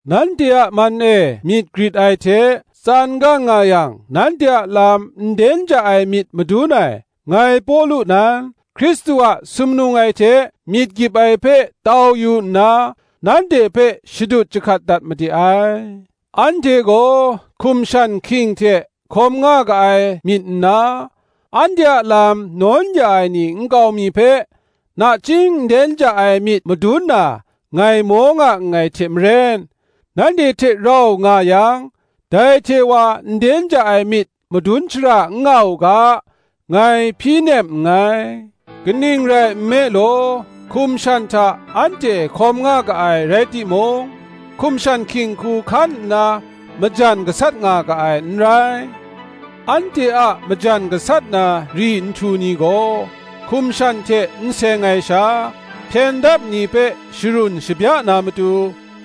Nanhte a man e myit grit ai hte, tsan gang nga yang nanhte a lam nden ja ai myit madun ai, ngai Pawlu nan, Hkristu a sumnung ai hte myit gyip ai hpe tau yu nna, nanhte hpe shadut jahkat dat made ai: anhte gaw hkum shan hking hte hkawm nga ga ai myit nna, anhte a lam nawn ya ai ni nkau mi hpe nachying nden ja ai myit madun na ngai maw nga nngai hte maren, nanhte hte rau nga yang, dai hte wa nden ja ai myit madun shara n nga u ga, ngai hpyi nem nngai. Kaning rai nme law, hkum shan hta anhte hkawm nga ga ai rai timung, hkum shan hking hku hkan nna majan gasat nga ga ai n rai; anhte a majan gasat na ri nhtu ni gaw hkum shan hte n seng ai sha, hpyen dap ni hpe sharun shabya na matu,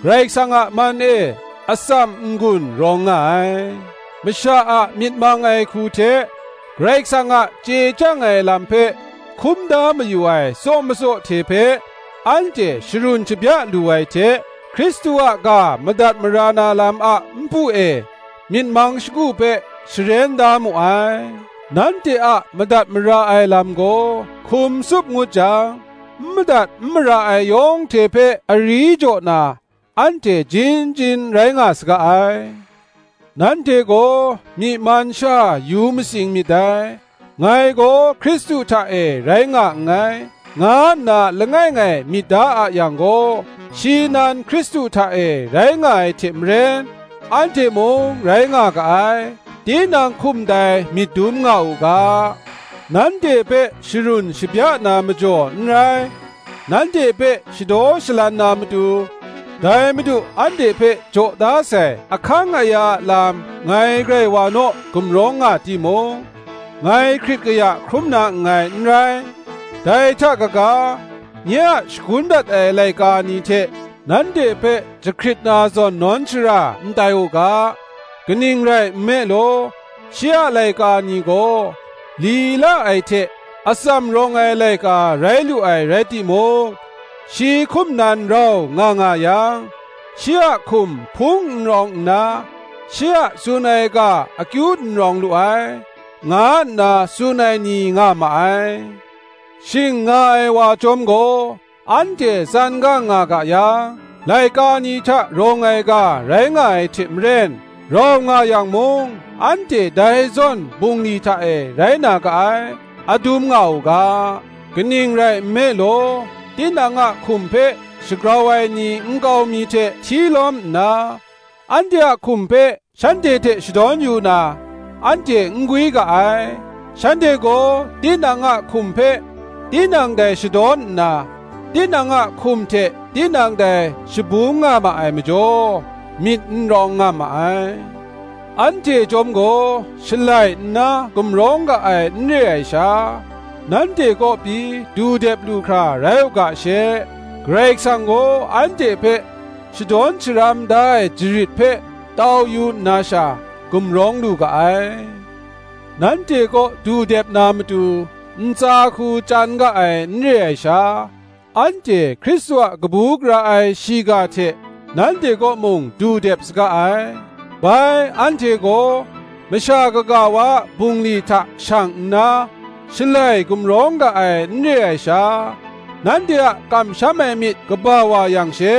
Karai Kasang a man e atsam n-gun rawng nga ai; masha a myit mang ai hku hte, Karai Kasang a chye chyang ai lam hpe hkum da mayu ai tsaw matsaw hte hpe, anhte sharun shabya lu ai hte, Hkristu a ga madat mara na lam a npu e myit mang shagu hpe sharen da mu ai; nanhte a madat mara ai lam gaw hkum tsup ngut jang, n madat n mara ai yawng hte hpe ari jaw na, anhte jin jin rai nga saga ai. Nanhte gaw myi man sha yu matsing myit dai. Ngai gaw Hkristu hta e rai nga nngai, nga nna langai ngai myit da a yang gaw, shi nan Hkristu hta e rai nga ai hte maren, anhte mung rai nga ga ai, tinang hkum dai myit dum nga u ga. Nanhte hpe sharun shabya na majaw n rai, nanhte hpe shadaw shalan na matu, dai Madu anhte hpe jaw da sai ahkang aya a lam ngai grai wa naw gumrawng nga timung, ngai hkrit kaya hkrum na nngai n rai; dai hta kaga, nye a shagun dat ai laika ni hte nanhte hpe jahkrit na zawn, nawn shara n tai u ga. Kaning rai nme law, shi a laika ni gaw li la ai hte atsam rawng ai laika rai lu ai rai timung, shi hkum nan rau nga nga yang, shi a hkum hpung n rawng nna, shi a tsun ai ga akyu n rawng lu ai, nga nna tsun ai ni nga ma ai. Shing nga ai wa chyawm gaw, anhte tsan gang nga ga yang, laika ni hta rawng ai ga rai nga ai hte maren, rau nga yang mung anhte dai zawn bungli hta e rai na ga ai, adum nga u ga. Kaning rai nme law, tinang a hkum hpe shagrau ai ni nkau mi hte hti lawm nna, anhte a hkum hpe shanhte hte shadawn yu na, anhte n gwi ga ai: shanhte gaw tinang a hkum hpe tinang dai shadawn nna, tinang a hkum hte tinang dai shabung nga ma ai majaw, myit n rawng nga ma ai. Anhte chyawm gaw shalai nna gumrawng ga ai n re ai sha, nanhte kaw pyi du dep lu hkra rai u ga she, Karai Kasang gaw anhte hpe shadawn sharam da ai jarit hpe tau yu nna sha, gumrawng lu ga ai. Nanhte kaw du dep na matu ntsa hku chyan ga ai n re ai sha, anhte Hkristu a kabu gara ai shiga hte nanhte kaw mung du dep saga ai. Bai anhte gaw masha kaga wa a bungli hta shang nna, shalai gumrawng ga ai n re ai sha, nanhte a kamsham ai myit kaba wa yang she,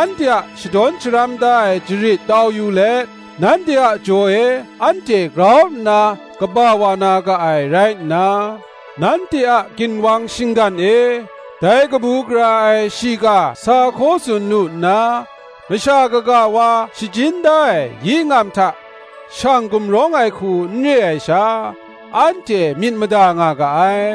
anhte a shadawn sharam da ai jarit tau yu let, nanhte a jaw e anhte grau nna kaba wa na ga ai rai nna, nanhte a ginwang shinggan e dai kabu gara ai shiga sa hkaw tsun lu nna, masha kaga wa shajin da ai yi ngam hta shang gumrawng ai hku n re ai sha, anhte myit mada nga ga ai.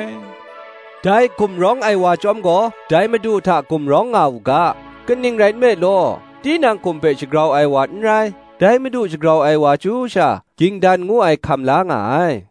Dai gumrawng ai wa chyawm gaw dai Madu hta gumrawng nga u ga. Kaning rai nme law, tinang hkum hpe shagrau ai wa n rai, dai Madu shagrau ai wa chyu sha, ging dan ngu ai hkam la nga ai.